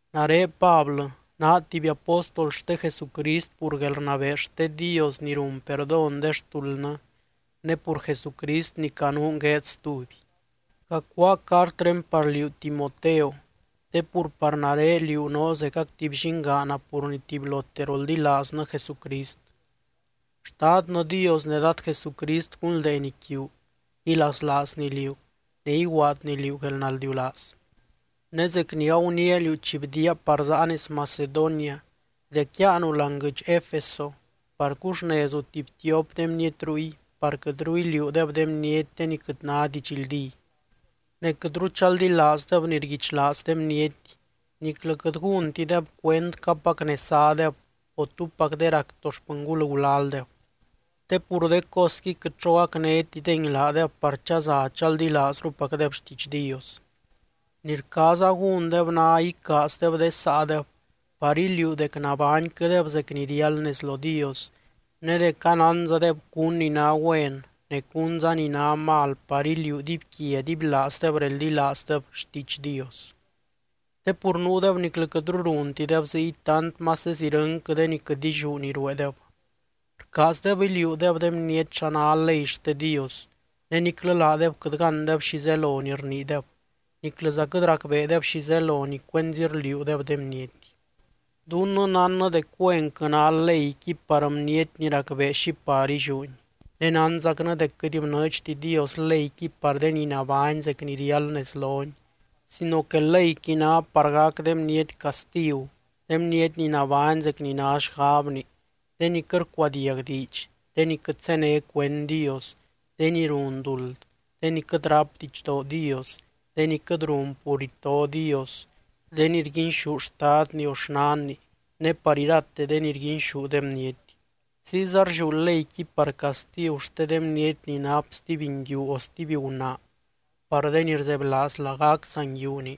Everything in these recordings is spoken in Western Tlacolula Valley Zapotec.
Nare Pablɨ, naa tuby apóstol xte Jesucrist pur guelrnabee xte Dios ni run perdón de xtuldnɨ ne pur Jesucrist ni canuun gueed stuby. Cacuáa cartré par liú Timoteo, te pur par nare liú noo zecac tuby llingaana pur ni tubylote roldilaaznɨ Jesucrist. Xtadnɨ Dios ne Dad Jesucrist gunldeeny quiu, ilaslaazny liú, ne iguaadny liú guelnaldiulaaz. Ne zec ni aguniia liú chi bdiaa par záa nez Macedonia, dec yáanu láani guɨdx Efeso, par cuxnezu tuby tiop de bniety ruy par quɨtru iliuudeb de bniety de ni quɨt ná didxldí. Ne quɨtru chaldilaazdeb ni rguichlaaz de bniety, niclɨ quɨt gúntideb cuend capac nez zádeb, o túpac de rac to xpɨngul gulaldeb, te pur de cosqui quɨt xo gacnétidengui laadeb par chaza chaldilaazrupacdeb xtiidx Dios. Ni rcaaza gúndeb ná icaazdeb de saadeb par iliuu dec nabányquɨdeb zec ni riáld nez lo Dios, ne dec anánzadeb cún ni ná güen ne cúnza ni ná mal par iliuu dibyquia dibylaazdeb reldilaazdeb xtiidx Dios. Te pur nuudeb niclɨ quɨtru runtideb ziy tant mases irɨnquɨ de ni quɨt illiú ni rueedeb. Rcaazdeb iliuudeb de bniety xa ná ley xte Dios, ne niclɨ laadeb quɨt gándeb xi zelo ni rniideb, niclɨza quɨt racbeedeb xi zelo ni cuenzi rliuudeb de bniety. Dunnɨ nánnɨ dec güenquɨ ná leyqui par bniety ni racbee xi par illiúni. Ne nánzacnɨ dec quɨt bnɨɨdxti Dios leyqui par de ni nabány zec ni riáld nez lony, sino que leyqui ná par gac de bniety castigu, de bniety ni nabány zec ni ná xgabni, de ni quɨt rcuadiag diidx, de ni quɨt zéne cuend Dios, de ni run duld, de ni quɨt ráp didxdoo Dios, de ni quɨt run pur ito Dios, de ni rguinxú xtadni o xnanni, ne par irate de ni rguinxú de bniety. Ziyza rlliú leyqui par castigu xte de bniety ni nap stuby nguiu o stuby gunaa, par de ni rzebylaaz lagac saa nguiuni,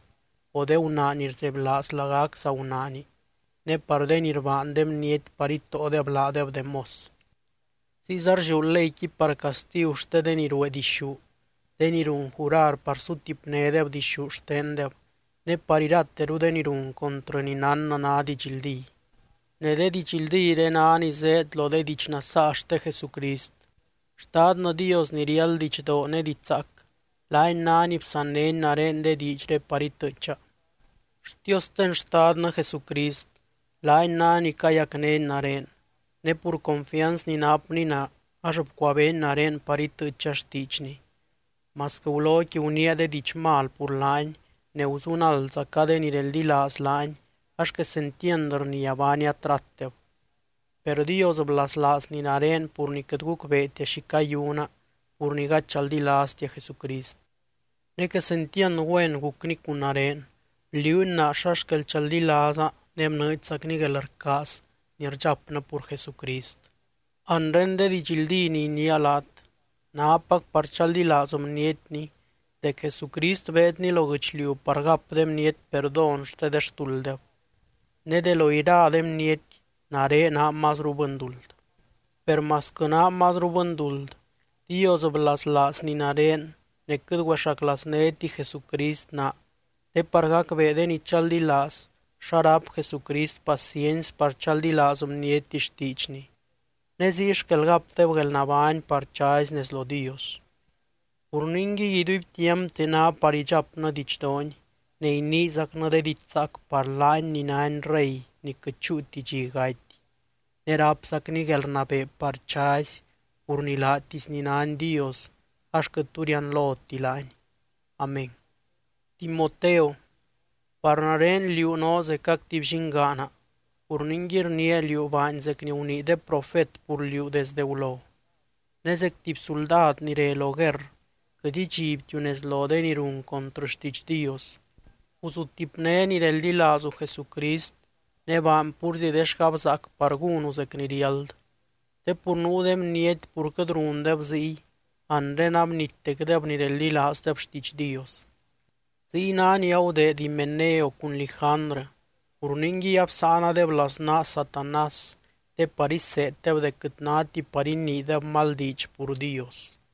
o de gunaa ni rzebylaaz lagac saa gunaani, ne par de ni rbaan de bniety par itóodeb laadeb de mos. Ziyza rlliú leyqui par castigu xte de ni ruee dixú, de ni run jurar par sutipnédeb dixú xtendeb, ne par irateru de ni run contrɨ ni nánnɨ ná didxldí. Ne de didxldíre ná ni zéed lo de diidx nasaa xte Jesucrist. Xtadnɨ Dios ni riáld didxdoo ne diidx zaac, laany ná ni bsannény nare de diidxré par itɨɨcha. Xtiosten Xtadnɨ Jesucrist laany ná ni cayacnény nare, ne pur confianz ni napny naa ax bcuabeeny nare par itɨɨcha xtiidxny, masquɨ guloqui guniia de diidx mal pur laany, ne guzunaldzaca de ni reldilaaz laany ax quesentiand rnia baania tratdeb. Per Dios blaslaazny nare pur ni quɨt gucbeetia xi cayuna pur ni gady chaldilaaztia Jesucrist. Ne quesentiand güen gucny cun nare, bliuuny naa xa xquel chaldilaaza ne bnɨɨdxzacny guelrcaaz ni rdxapnɨ pur Jesucrist. Anre de didxldí ni iniia laat, nápac par chaldilaaz bnietni dec Jesucrist beedny lo guɨchliu par gap de bniety perdón xte de xtulddeb, ne de lo ira de bniety, nare naa mazru bɨnduld. Per masquɨ naa mazru bɨnduld, Dios blaslaazny nare ne quɨt güexaclaaznéti Jesucrist naa te par gacbee de ni chaldilaaz xa ráp Jesucrist paciency par chaldilaaz bniety xtiidxny, ne ziy xquel gapdeb guelnabány par chazy nez lo Dios. Pur ningui, iduibtiampte ná par idxapnɨ didxdoony ne iniizacnɨ de diidx zaac par laany ni nány Rey ni quɨt chúuti dxi gaty, ne rápzacny guelrnabee par chazy pur ni laatisny nány Dios ax quɨt tu rianloti laany. Amén. Timoteo, par nare liú noo zecac tuby llingaana pur ningui rniia liú baany zec ni gunii de profet pur liú desde gulo, ne zec tuby suldad ni re lo guerr quɨt idxibtiu nez lo de ni run contrɨ xtiidx Dios. Guzutipné ni reldilaazu Jesucrist, ne baany púrzi de xgabzaac par gúnu zec ni riáld. Te pur nuu de bniety pur quɨt rundeb ziy, anre abnittecdeb ni reldilaazdeb xtiidx Dios. Ziy ná ni agudeed Himeneo cun Lijandrɨ, pur ningui absáanadeb laznaa Satanás te par iseeddeb dec quɨt náti par iniideb mal diidx pur Dios.